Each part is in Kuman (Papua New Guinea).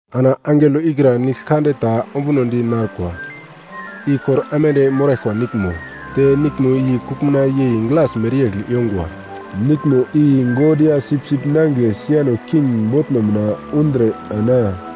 Ana angelo ikra nigl kande ta ombunodi narkwa, i kor aimande moraglkwa niglmo, te niglmo i kuglmuna yei glas mereyegl yongwa. Niglmo i God ya Sipsip Nangigle siano king botno mina undre ana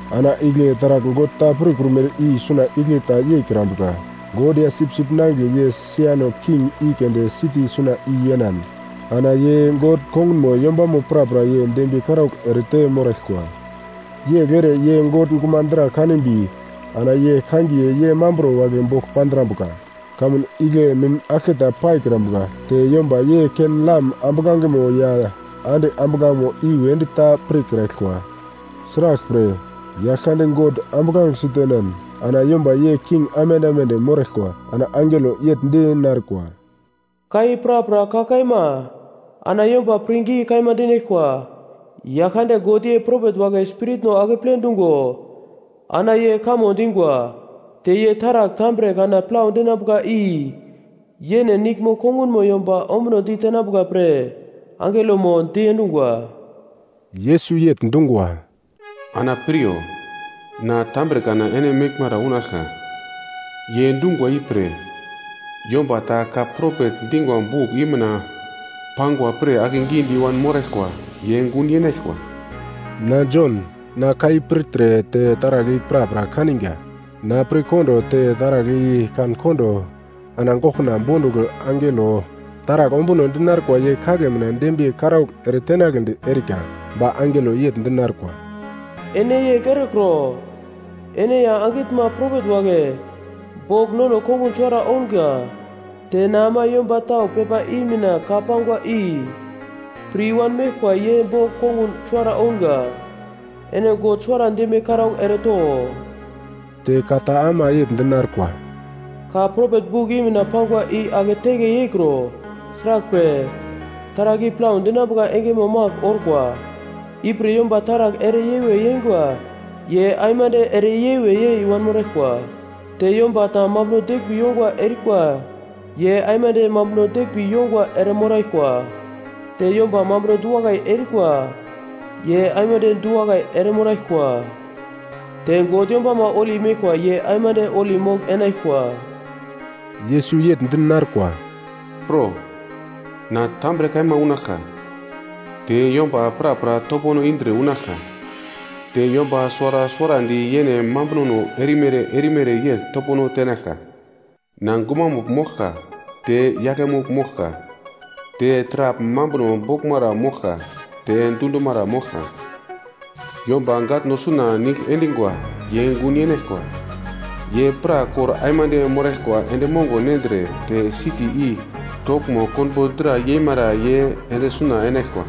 Ana igle taragl God ta prukrumere i suna igle ta yeikrambuka. God ya Sipsip Nangigle ye siano king i keunde siti suna i yenan ana ye God kongunmo yombamo prapra ye dembiye karaugl erete moraglkwa. Yegl ere ye God gumadra kanimbi ana ye kangiye ye mamburo wagle bogl pandrambuka. Kamun igle mim aglketa paikrambuka. Te yomba ye ken-lam ambuglangemo ya ande ambuglangeno i wedi ta pirkraglkwa. Sraglpre, Yaglkande God ambuglange sitenan ana yomba ye king aimande aimande moraglkwa. Ana angelo yegl di narkwa, “Ka i prapra ka kaima, ana yomba pirngi kaima dinaglkwa. Yaglkande God ye propet wagle spiritno akeple dungo ana ye kamo dingwa. Te ye taragl tambre kana plau dinambuka i yene niglmo kongunmo yomba ombuno ditenambuka pre angelomo diendungwa.” Yesus yegl dungwa, “Ana piryo! Na tambre kana ene meglmara unaglka. Ye dungwa ipre, yomba ta ka propet dingwa buk i mina pangwa pir akegidi i-wan moraglkwa ye gun yenaglkwa.” Na Jon, na ka i pirtre te taragl i prapra kaniga. Na pirkondo te taragl i kan-kondo ana goglkuna bondugl angelo taragl ombuno dinarkwa ye kagle mina dembiye karaugl eretenagledi erika. Ba angelo yegl di narkwa, “Ene yegl erekro! Ene ya angitnma propet wagle bogl nono kongun suwara ounga. Te na ama yomba tau pepa i mina ka pangwa i pir i-wan meglkwa ye bogl kongun suwara ounga. Ene God suwara dembiye karaugl ereto.” Te ka ta ama yegl di narkwa, “Ka propet buk i mina pangwa i ake teke yeikro. Sraglpre, taragl i plau dinambuka engemo magl orkwa. Ipre yomba taragl ere yewe yeingwa ye aimande ere yewe yei wanmoraglkwa; te yomba ta mambuno deglmbi yongwa erikwa ye aimande mambuno deglmbi yongwa eremoraglkwa. Te yomba mambuno du-wakai erikwa ye aimande du-wakai eremoraglkwa. Te God yombama holi meglkwa ye aimande holi mogl-enaglkwa.” Yesus yegl di narkwa, “Pro! Na tambre kaima unaglka, te yomba prapra topono indre unaglka, te yomba suwara suwarandi yene mambunono erumere erumere yegl topono tenaglka. Na Gumamugl moglka te Yaglemugl moglka, te Taragl Mambuno Boglmara moglka te Dundumara moglka. “Yomba gatno suna nigl endingwa ye gun yenaglkwa, ye pra kor aimande moraglkwa endi mongo nendre te siti i toglmo konbo dra yemara ye ende suna enaglkwa.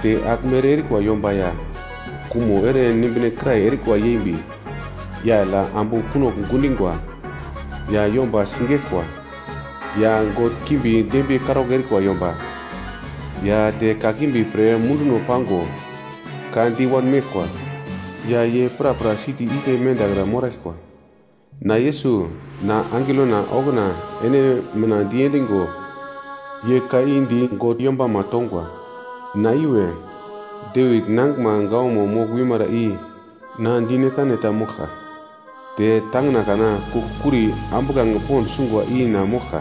Te agl mere erikwa yomba ya kumo ere nimbine kirai erikwa yembi, yagl ya ambu kunogl gundingwa, ya yomba sigeglkwa, ya god kimbi dembiye karaugl erikwa yomba, ya te kakimbi pre munduno pango ka di wanmeglkwa, ya ye prapra siti igle mendakra moraglkwa. “Na Yesus, na angelona okuna ene mina diendigo ye ka i di God yombama tongwa. Na iwe, Devit nangiglma gawamo mogl wimara i mina na dire-kane ta moglka, te tangina kana kugl-kuri ambuglange pond sungwa i na moglka.”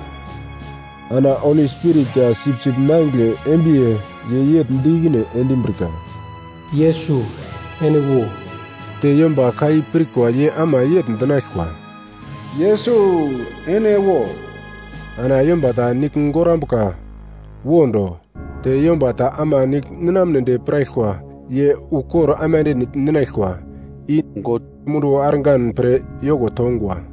Ana Holi Spirit ya Sipsip Nangigle embiye, ye yegl di ikine endimbrika, “Yesus, ene wo!” Te yomba ka i pirkwa ye ama yegl dinaglkwa, “Yesus, ene wo!” Ana yomba ta nigl gorambuka, wo do, te yomba ta ama nigl ninamnedi piraglkwa ye ukor aimande nigl ninaglkwa, i God munduwo argan pre yoko tongwa.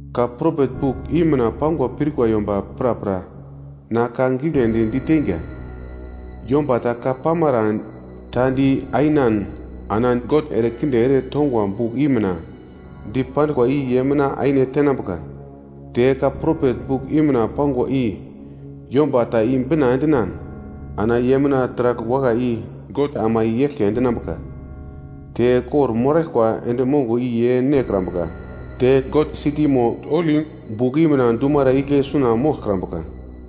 Ka propet buk i mina pangwa pirkwa yomba prapra na ka giglendi di teinga. Yomba ta ka pamara ta di ainan ana God ere kinde ere tongwa buk i mina dipanduglkwa i ye mina aine tenambuka. Te ka propet buk i mina pangwa i yomba ta i-bina endinan ana ye mina taragl wakai i God ama i-eglke endinambuka. Te kor-moraglkwa endi mongo i ye nekrambuka te God sitimo holi buk i mina dumara igle suna moglkrambuka.”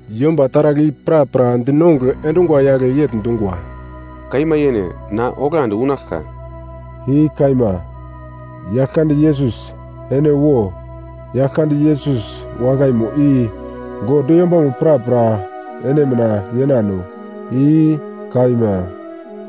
Yomba taragl i prapra dinongugl endungwa yagle yegl dungwa, “Kaima yene, na oglandi unaglka!” I kaima, Yaglkande Yesus, ene wo! Yaglkande Yesus wakaimo i God yombamo prapra ene mina yenano. I kaima.